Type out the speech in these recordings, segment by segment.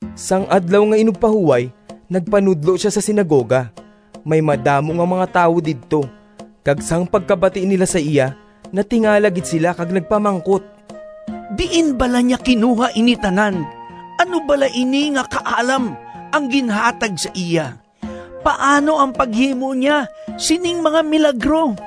Sang Adlaw nga Inugpahuway nagpanudlo sia sa sinagoga. May madamo nga mga tawo didto, kag sang pagkabati nila sa iya natingala gid sila kag nagpamangkot, “Diin bala niya kinuha ini tanan? Ano bala ini nga kaalam ang ginhatag sa iya? Paano ang paghimo niya sining mga milagro?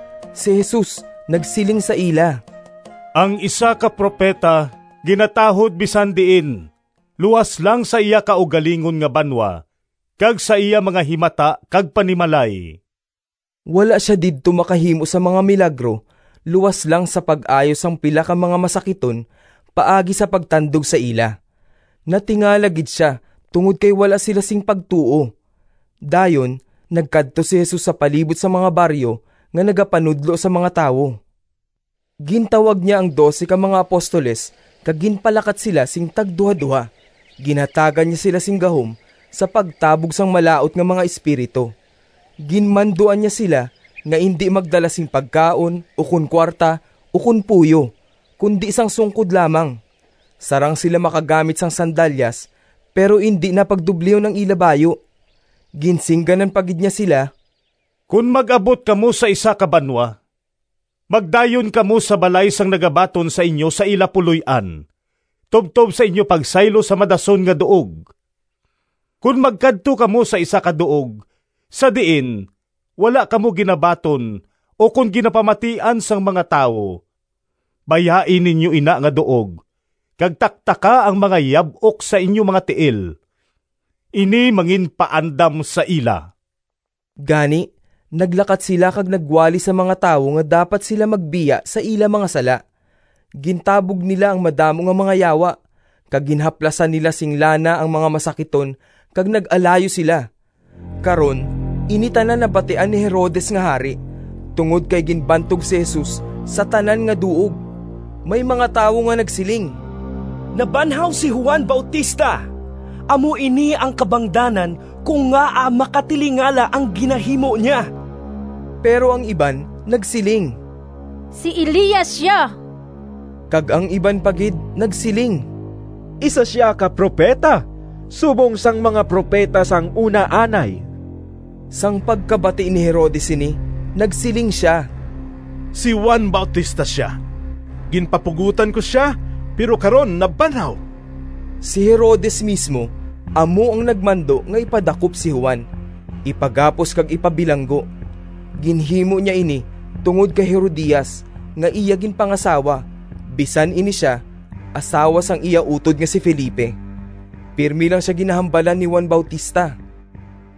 Si Jesus nagsiling sa ila, “Ang isa ka propeta ginatahod bisan diin luas lang sa iya kaugalingon nga banwa kag sa iya mga himata kag panimalay.” Wala sia didto makahimo sang mga milagro luas lang sa pag-ayo sang pila ka mga masakiton paagi sa pagtandog sa ila. Natingala gid sia tungod kay wala sila sing pagtuo. Dayon nagkadto si Jesus sa palibot nga mga baryo nga nagapanudlo sa mga tawo. Gintawag niya ang dose ka mga apostoles kag ginpalakat sila sing tagduhadoha. Ginhatagan niya sila sing gahom sa pagtabog sang malaut nga mga espiritu. Ginmanduan niya sila nga indi magdala sing pagkaon ukon kuwarta ukon puyo, kundi sang sungkod lamang. Sarang sila makagamit sang sandalyas pero indi na pagdublihon ang ila bayu. Ginsingganan pa gid niya sila, “Kon mag-abot kamo sa isa ka banwa magdayon kamo sa balay sang nagabaton sa inyo sa ila puloy-an tubtob sa inyo pagsaylo sa madason nga duog. Kon magkadto kamo sa isa ka duog sa diin wala kamo ginabaton ukon ginapamatian sang mga tawo bayai ninyo ina nga duog kag taktaka ang mga yab-ok sa inyo mga tiil. Ini manginpaandam sa ila.” Gani naglakat sila kag nagwali sa mga tawo nga dapat sila magbiya sa ila mga sala. Gintabog nila ang madamo nga mga yawa, kag ginhaplasan nila sing lana ang mga masakiton kag nag-alayo sila. Karon ini tanan nabatian ni Herodes nga hari tungod kay ginbantog si Jesus sa tanan nga duog. May mga tawo nga nagsiling, “Nabanhaw si Juan Bautista! Amo ini ang kabangdanan kon ngaa makatilingala ang ginahimo niya.” Pero ang iban nagsiling, “Si Elias sia.” Kag ang iban pa gid nagsiling, “Isa sia ka propeta subong sang mga propeta sang una anay.” Sang pagkabati ni Herodes sini nagsiling sia, “Si Juan Bautista sia! Ginpapugotan ko sia, pero karon nabanhaw!” Si Herodes mismo amo ang nagmando nga ipadakop si Juan, ipagapos kag ipabilanggo. Ginhimo niya ini tungod kay Herodias nga iya ginpangasawa bisan ini sia asawa sang iya utod nga si Felipe. Pirme lang sia ginahambalan ni Juan Bautista,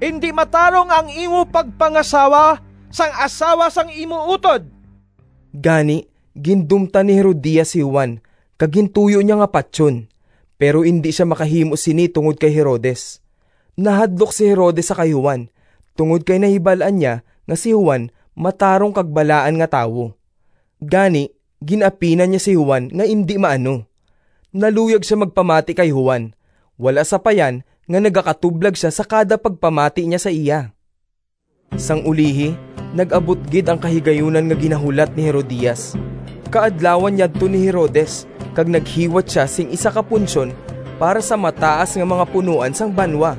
“Indi matarong ang imo pagpangasawa sang asawa sang imo utod!” Gani gindumtan ni Herodias si Juan kag gintuyo niya nga patyon, pero indi sia makahimo sini tungod kay Herodes. Nahadlok si Herodes sa kay Juan tungod kay nahibal-an niya nga si Juan matarong kag balaan nga tawo. Gani, gin-apinan niya si Juan nga indi maano. Naluyag sia magpamati kay Juan wala sapayan nga nagakatublag sia sa kada pagpamati niya sa iya. Sang ulihi nag-abot gid ang kahigayunan nga ginahulat ni Herodias. Kaadlawan yadto ni Herodes kag naghiwat sia sing isa ka punsyon para sa mataas nga mga punoan sang banwa,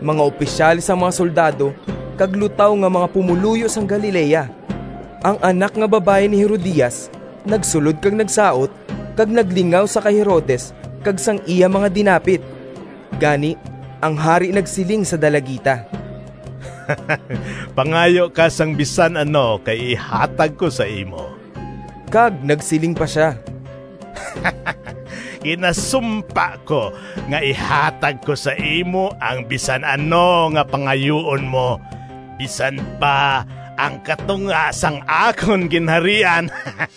mga opisyales sang mga soldado kag lutaw nga mga pumoluyo sang Galilea. Ang anak nga babayi ni Herodias nagsulod kag nagsaot, kag naglingaw sa kay Herodes kag sang iya mga dinapit. Gani ang hari nagsiling sa dalagita, “Pangayo ka sang bisan ano kay ihatag ko sa imo.” Kag nagsiling pa sia, “Ginasumpa ko nga ihatag ko sa imo ang bisan ano nga pangayuon mo, bisan pa ang katunga sang akon ginharian.”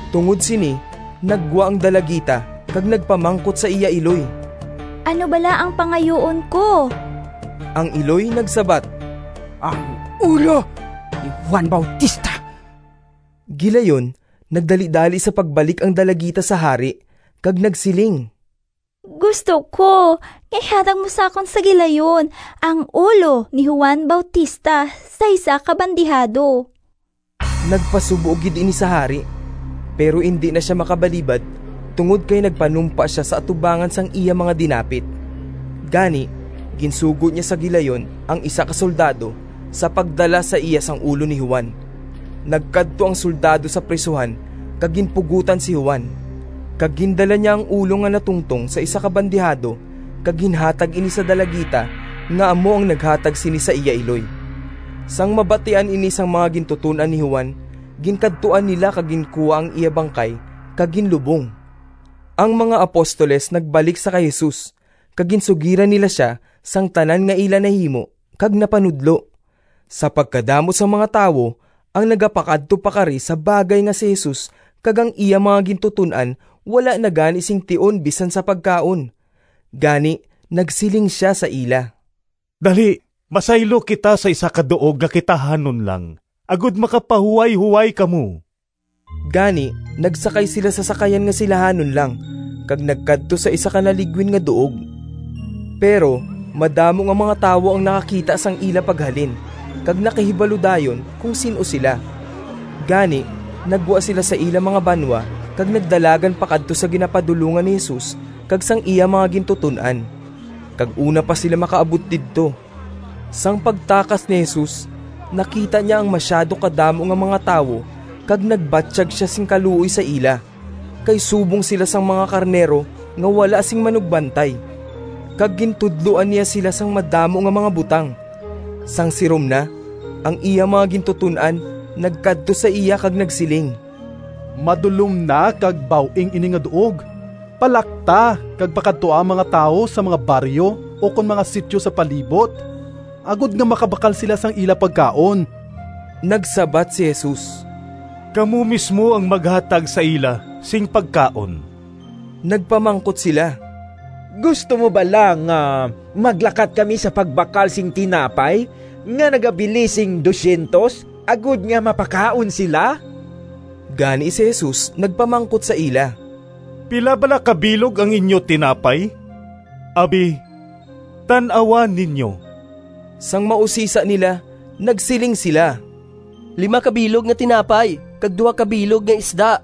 Tungod sini naggwa ang dalagita kag nagpamangkot sa iya iloy, “Ano bala ang pangayuon ko?” Ang iloy nagsabat, “Ang ulo ni Juan Bautista.” Gilayon nagdalidali sa pagbalik ang dalagita sa hari kag nagsiling, “Gusto ko nga ihatag mo sa akon sa gilayon ang ulo ni Juan Bautista sa isa ka bandihado!” Nagpasubo gid ini sa hari, pero indi na sia makabalibad tungod kay nagpanumpa sia sa atubangan sang iya mga dinapit. Gani ginsugo niya sa gilayon ang isa ka soldado sa pagdala sa iya sang ulo ni Juan. Nagkadto ang soldado sa prisuhan kag ginpugotan si Juan. Kag gindala niya ang ulo nga natungtong sa isa ka bandihado kag ginhatag ini sa dalagita nga amo ang naghatag sini sa iya iloy. Sang mabatian ini sang mga gintuton-an ni Juan, ginkadtuan nila kag ginkuha ang iya bangkay kag ginlubong. Ang mga apostoles nagbalik sa kay Jesus kag ginsugiran nila sia sang tanan nga ila nahimo kag napanudlo. Sa pagkadamo sang mga tawo ang nagapakadto pakari sa bagay nga si Jesus kag ang iya mga gintuton-an wala na gani sing tion bisan sa pagkaon. Gani nagsiling sia sa ila. “Dali masaylo kita sa isa ka duog nga kitahanon lang agod makapahuwayhoway kamo.” Gani nagsakay sila sa sakayan nga silahanon lang kag nagkadto sa isa ka naligwin nga duog. Pero madamo nga mga tawo ang nakakita sang ila paghalin kag nakahibalo dayon kon sin-o sila. Gani naggwa sila sa ila mga banwa kag nagdalagan pakadto sa ginapadulongan ni Jesus kag sang iya mga gintuton-an, kag una pa sila makaabot didto. Sang pagtakas ni Jesus, nakita niya ang masyado kadamo nga mga tawo kag nagbatyag sia sing kaluoy sa ila kay subong sila sang mga karnero nga wala sing manugbantay. Kag gintudloan niya sila sang madamo nga mga butang. Sang sirom na, ang iya mga gintuton-an nagkadto sa iya kag nagsiling, “Madulom na kag baw-ing ini nga duog. Palakta kag pakadtoa ang mga tawo sa mga baryo ukon mga sityo sa palibot agod nga makabakal sila sang ila pagkaon.” Nagsabat si Jesus, “Kamo mismo ang maghatag sa ila sing pagkaon.” Nagpamangkot sila, “Gusto mo bala nga maglakat kami sa pagbakal sing tinapay nga nagabili sing P200 agod nga mapakaon sila?” Gani si Jesus nagpamangkot sa ila, “Pila bala ka bilog ang inyo tinapay? Abi tan-awa ninyo.” Sang mausisa nila, nagsiling sila, “Lima ka bilog nga tinapay kag duha ka bilog nga isda.”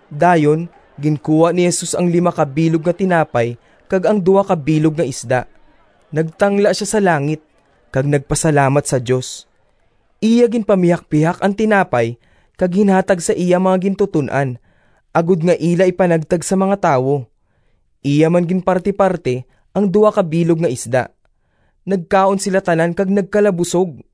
Dayon ginkuha ni Jesus ang lima ka bilog nga tinapay kag ang duha ka bilog nga isda, nagtangla sia sa langit, kag nagpasalamat sa Dios. Iya ginpamihakpihak ang tinapay kag ginhatag sa iya mga gintuton-an agod nga ila ipanagtag sa mga tawo. Iya man ginpartiparti ang duha ka bilog nga isda. Nagkaon sila tanan kag nagkalabusog.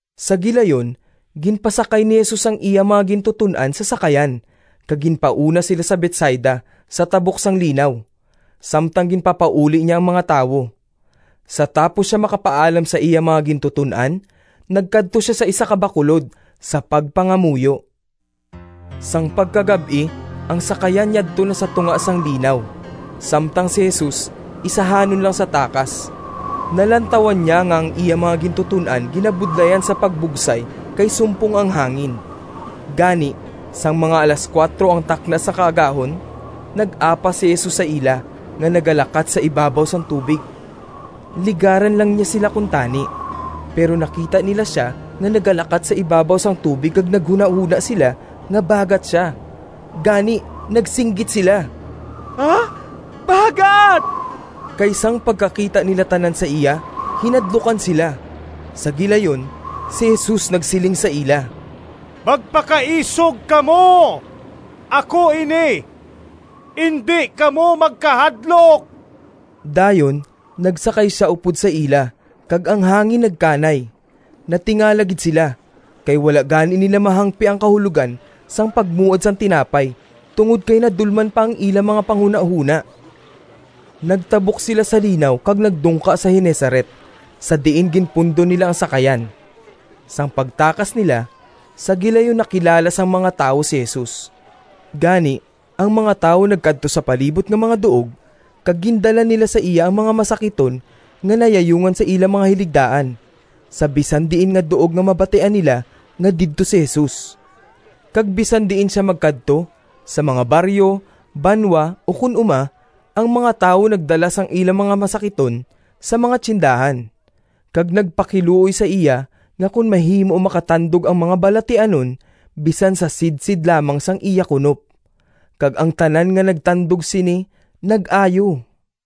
Sa gilayon ginpasakay ni Jesus ang iya mga gintuton-an sa sakayan kag ginpauna sila sa Betsaida sa tabok sang linaw, samtang ginpapauli niya ang mga tawo. Sa tapos sia makapaalam sa iya mga gintuton-an nagkadto sia sa isa ka bakulod sa pagpangamuyo. Sang pagkagab-i, ang sakayan yadto na sa tunga sang linaw, samtang si Jesus isahanon lang sa takas. Nalantawan niya nga ang iya mga gintuton-an ginabudlayan sa pagbugsay kay sumpong ang hangin. Gani sang mga alas kuwatro ang takna sa kaagahon, nag-apas si Jesus sa ila nga nagalakat sa ibabaw sang tubig. Ligaran lang niya sila kuntani, pero nakita nila sia nga nagalakat sa ibabaw sang tubig kag naghunahona sila nga bagat sia. Gani nagsinggit sila, “Bagat!” Kay sang pagkakita nila tanan sa iya hinadlukan sila. Sa gilayon si Jesus nagsiling sa ila, “Magpakaisog kamo! Ako ini. Indi kamo magkahadlok!” Dayon nagsakay sia upod sa ila kag ang hangin nagkanay. Natingala gid sila, kay wala gani nila mahangpi ang kahulogan sang pagmuad sang tinapay tungod kay nadulman pa ang ila mga panghunahona. Nagtabok sila sa linaw kag nagdungka sa Genezaret sa diin ginpundo nila ang sakayan. Sang pagtakas nila, sa gilayon nakilala sang mga tawo si Jesus. Gani ang mga tawo nagkadto sa palibot nga mga duog kag gindala nila sa iya ang mga masakiton nga nayayungan sa ila mga hiligdaan sa bisan diin nga duog nga mabatian nila nga didto si Jesus. Kag bisan diin sia magkadto, sa mga baryo, banwa ukon uma, ang mga tawo nagdala sang ila mga masakiton sa mga tiyendahan, kag nagpakiluoy sa iya nga kon mahimo makatandog ang mga balatianon bisan sa sidsid lamang sang iya kunop, kag ang tanan nga nagtandog sini nag-ayo.